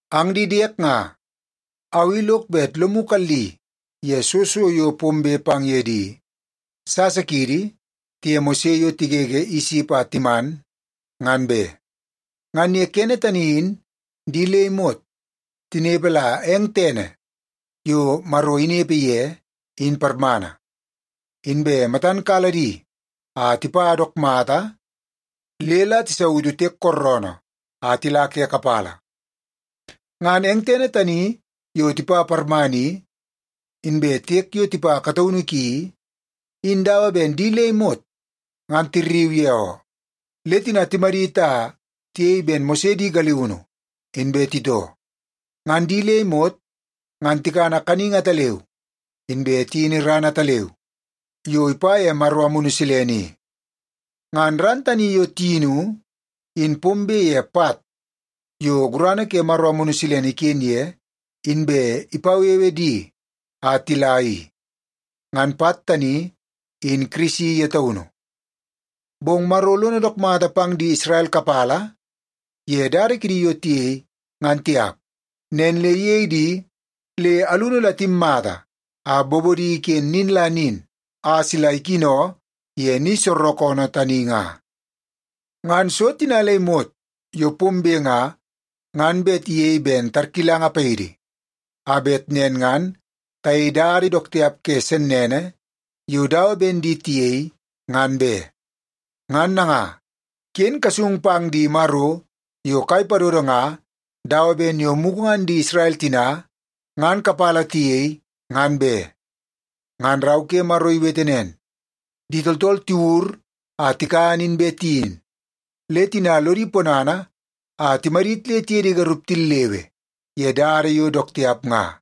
Ang di diek nga, au i lok bet lomu kalli ye soo so yo pombe pang ye di sasa kiidi tiye Mose yo tigege Isip a timan, ngan be. Ngan ye kene tani in di le imot tinepe la eng tene yo Maro inepe ye in parmana, inbe matan kala di a tipa dook mata le la tisautu Tiek Kooroonoo a tila ke kapala. Ngan eng tene tani yo tipa parmana i, inbe tiek yo tipa kataunu ki i, in dawa ben di le imot ngan tirriu ye oo. Le tina timadit a tiyei ben Mose di galiunu inbe titoo. Ngan di le imot ngan tikana kaningi ataleu inbe tiyini ran ataleu yo ipa ye Maro Amunu Silene i. Ngan ran tani yo tiyinu in pombe ye pat yo gurana ke Maro Amunu Silene iken ye inbe ipawewe di a tila i. Ngan pat tani in Kirisi ye taunu. Bong Maro lono dook mata pang di Isrel kapala ye dada kidi yo tiyei, ngan tiap. Nen le iyei di le alunu la timmata a bobodi iken nin la nin a sila ikino ye ni soorookoonoo tani nga. Ngan so tina le imot yo pombe nga, ngan bet iyei ben tarkilanga paidi, a bet nen ngan tayei dada dook tiap ke sennene yo dawa ben di tiyei nga, ngan be. Ngan nanga, ken kasung pang di maro yo kai padodo nga dawa ben yo mugu ngan di Isrel tina ngan kapala tiyei, ngan be. Ngan Rau ke Maro iwete nen, “Di tooltool tiwur a tikan inbe tiyin, le tina lodi ponana a timadit le tiye di garup tillewe ye dada yo dook tiap nga.”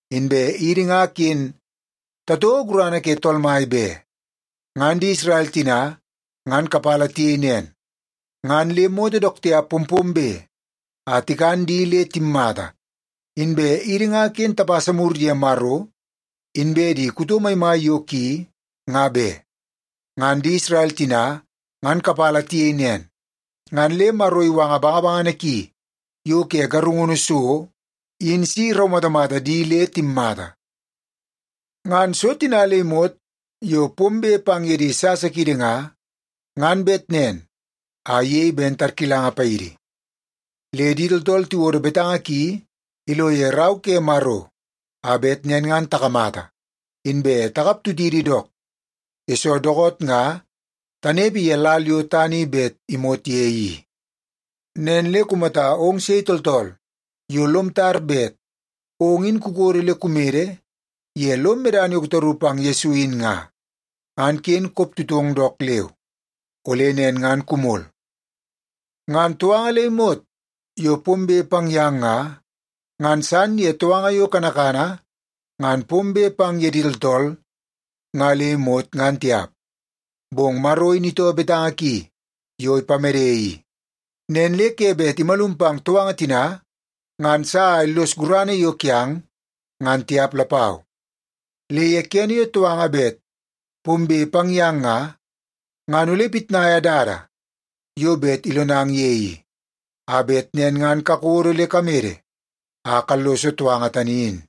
Inbe idi nga ken tatouo gurana ke Tool Mai be. Ngan di Isrel tina ngan kapala tiyei nen, ngan le moto dook tiap pompombe a tikan di le timmata. Inbe idi nga ken tapasa mur ye Maro inbe di kuto maimai yo ki, nga be. Ngan di Isrel tina ngan kapala tiyei nen, ngan le Maro iwanga bangabangana ki yo ke garungunu so in si iraumatamata di le timmata. Ngan so tina le imot yo pombe pang ye di sasa kiidi nga, ngan bet nen a iyei ben tarkilanga paidi. Le di tooltool tiwodo betanga ki ilo ye Rau ke Maro a bet nen ngan takamata, inbe takap tutidi dook, yesoo dookoot nga tanepe ye lal yo tana i bet imot ye i. Nen le kumata ong sei tooltool yo lom tar bet ong in kukodo le kumede ye lom medana yo kutaru pang Yesu in nga, ngan ken kop tutong dook leu. Ole nen ngan kumol. Ngan touanga le imot yo pombe pang yang nga, ngan san ye touanga yo kanakana ngan pombe pang ye di tooltool nga le imot ngan tiap. Bong Maro in itoo betanga ki yo ipamede i, nen le ke bet imalum pang touanga tina ngan sa a illos gurana yo kiang, ngan tiap lapau. Le ye kene yo touanga bet pombe pang yang nga, ngan ole ipitnaia dada yo bet ilonang ye i, a bet nen ngan kakodo le kamede a kalloso touanga tani in.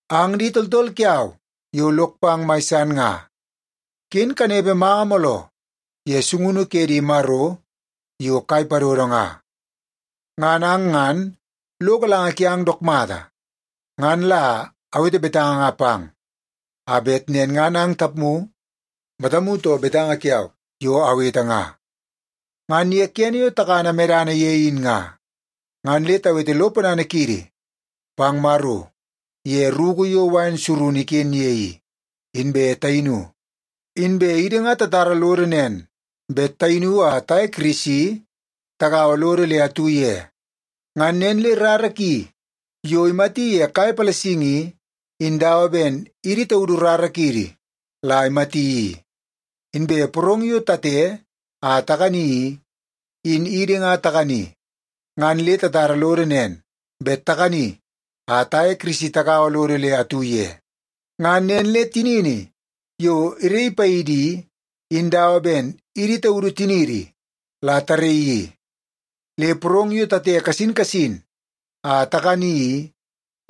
Ang di tooltool kiau yo lok pang mai san nga, ken kanepe manga mooloo ye sungunu ke di maro yo kai padodo nga. Ngan ang ngan lo galanga kiang dook mata. Ngan la awete betanga nga pang a bet nen ngan ang tapmu matamu too betanga kiau yo awete nga. Ngan ye kene yo takana medana ye in nga, ngan le tawete lo ponana kiidi pang Maro ye ruku yo ooroo wain surunu iken ye i, inbe tayinu. Inbe idi ngan tatara lodo nen bet tayinu a taye Kirisi tagaua lodo le atu ye. Ngan nen le rara ki yo imati ye kai palasingi i, in dawa ben idi taudu rara kiidi la imati i. Inbe porong yo tate a takani i, in idi nga takani ngan le tatara lodo nen bet takani a taye Kirisi tagaua lodo le atu ye. Ngan nen le tinini yo iraii paidi i, in dawa ben idi taudu tiniidi la taraii i. Le porong yo tate kasin kasin a takani i,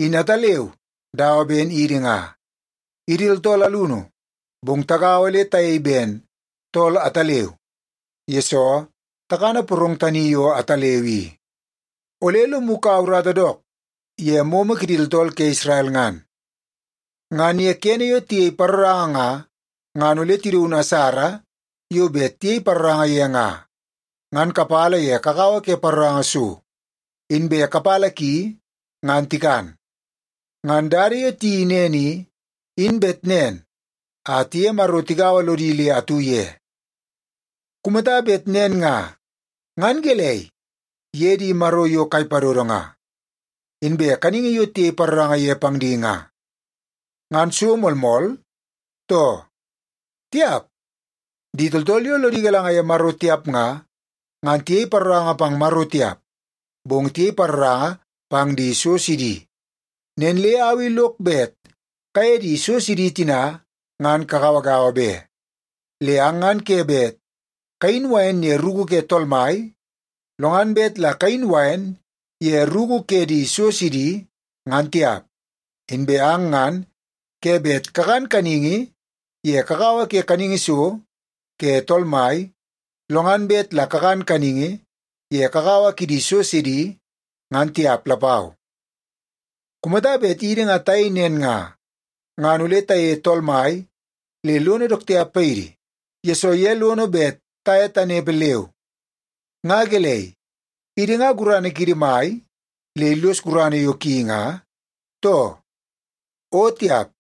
in ataleu dawa ben idi nga. Idi tooltool alunu, bong tagaua le tayei ben tool ataleu, yesoo takana porong tani yo ataleu i. Ole lomu kaua urata dook ye momo kidi tooltool ke Isrel ngan. Ngan ye kene yo tiyei paroranga nga, ngan ole tidaun asara yo bet tiyei paroranga ye nga, ngan kapala ye kakawa ke paroranga so, inbe kapala ki ngan tikan. Ngan dada yo tiyeii nen i, in bet nen a tiye Maro tigaua lodi le atu ye. Kumata bet nen nga, ngan gelei ye di maro yo kai padodo nga, inbe kaningi yo tiyei paroranga ye pang di nga? Ngan so moolmool, too? Tiap! Di tooltool yo lodi galanga ye Maro tiap nga, ngan tiyei paroranga pang Maro tiap, bong tiyei paroranga pang di so sidi. Nen le au i lok bet kaye di so sidi tina ngan kagauagaua be. Le ang ngan ke bet kayin wain ye ruku ke Tool Mai, lo ngan bet la kayin wain ye ruku ke di so sidi, ngan tiap. Inbe ang ngan ke bet kakan kaningi ye kakawa ke kaningi so ke Tool Mai, lo ngan bet la kakan kaningi ye kakawa kidi so sidi, ngan tiap lapau. Kumata bet idi nga tayei nen nga, ngan ole tayeie Tool Mai le lono dook tiap paidi, yesoo ye lono bet taye tanepe leu. Nga gelei, idi nga gurana kiidi mai le illos gurana yo ki nga, too? O tiap!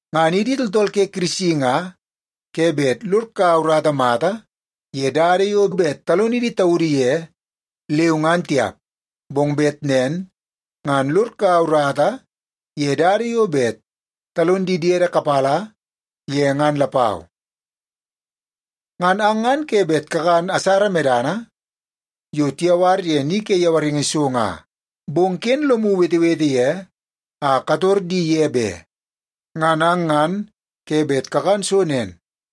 Ngan idi tooltool ke Kirisi nga ke bet lod kaua urata mata ye dada yo bet talonidi taudu ye leu ngan tiap, bong bet nen ngan lod kaua urata ye dada yo bet talon di diede kapala ye ngan lapau. Ngan ang ngan ke bet kakan asara medana yo tiyawar ye ni ke yawaringi so nga, bong ken lomu wetewete ye a kator di ye be. Ngan ang ngan ke bet kakan so nen,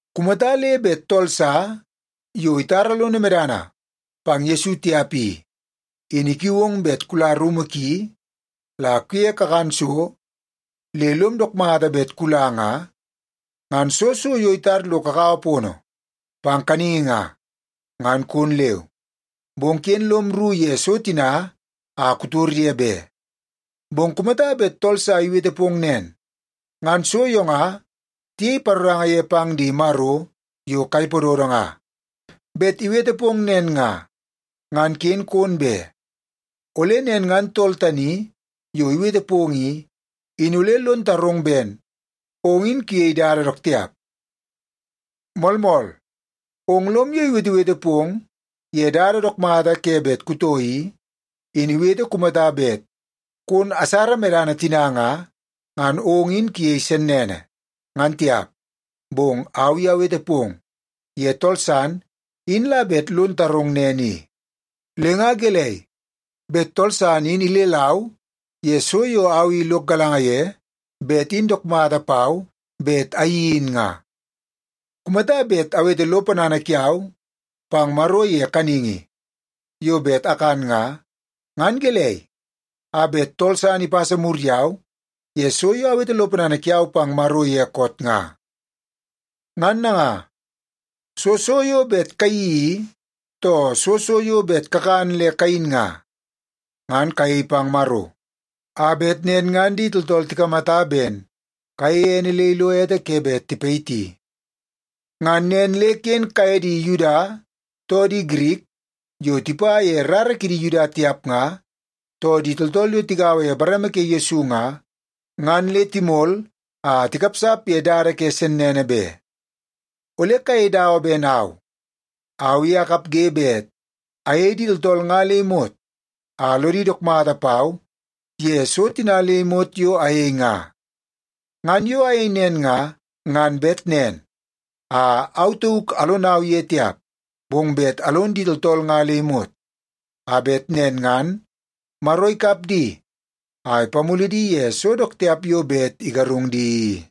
Kumata le bet tool sa yo itara lono medana pang Yesu tiap i, in ikiu ong bet kula rumu ki la kuye kakan so le lom dook mata bet kula nga, ngan soo so yo itar lo kakawa pono pang kaningi nga, ngan kon leu. Bong ken lom rru ye so tina a kutor ye be. Bong kumata bet tool sa iwete pong nen, “Ngan so yo nga tiyei paroranga ye pang di maro yo kai padodo nga,” bet iwete pong nen nga, ngan ken kon be. Ole nen ngan tool tani yo iwete pong i, in ole lon tarong ben ong in kuyei dada dook tiap. Moolmool, ong lom yo iwetewete pong ye dada dook mata bet kutoo i, in iwete kumata bet kon asara medana tina nga, ngan ong in kuyei sennene, ngan tiap. Bong au i awete pong ye tool san in la bet lon tarong nen i. Le nga gelei, bet tool san in ilelau ye so yo au i lok galanga ye bet in dook mata pau bet ayeii in nga? Kumata bet awete lo ponana kiau pang Maro ye kaningi yo bet akan nga, ngan gelei a bet tool san ipasa mur yau ye so yo awete lo ponana kiau pang Maro ye koot nga? Ngan nanga, soo so yo bet kayeii i, too soo so yo bet kakan le kayin nga, ngan kayei pang Maro, a bet nen ngan di tooltool tikamata ben kayeie ene le ilo ete ke bet tipayiti. Ngan nen le ken kayei di Yuda, too di Girik yo tipa ye rara kidi Yuda tiap nga, too di tooltool yo tigaua ye bareme ke Yesu nga, ngan le timol a tikapsap ye dada ke sennene be. Ole kayei dawa ben au. Au i akapge bet ayei di tooltool nga le imot a lodi dook mata pau ye so tina le imot yo ayei nga. Ngan yo ayei nen nga, ngan bet nen a au tauk alonau ye tiap, bong bet alon di tooltool nga le imot, a bet nen ngan Maro ikap di a ipamulu di ye so dook tiap yo bet igarungu di i.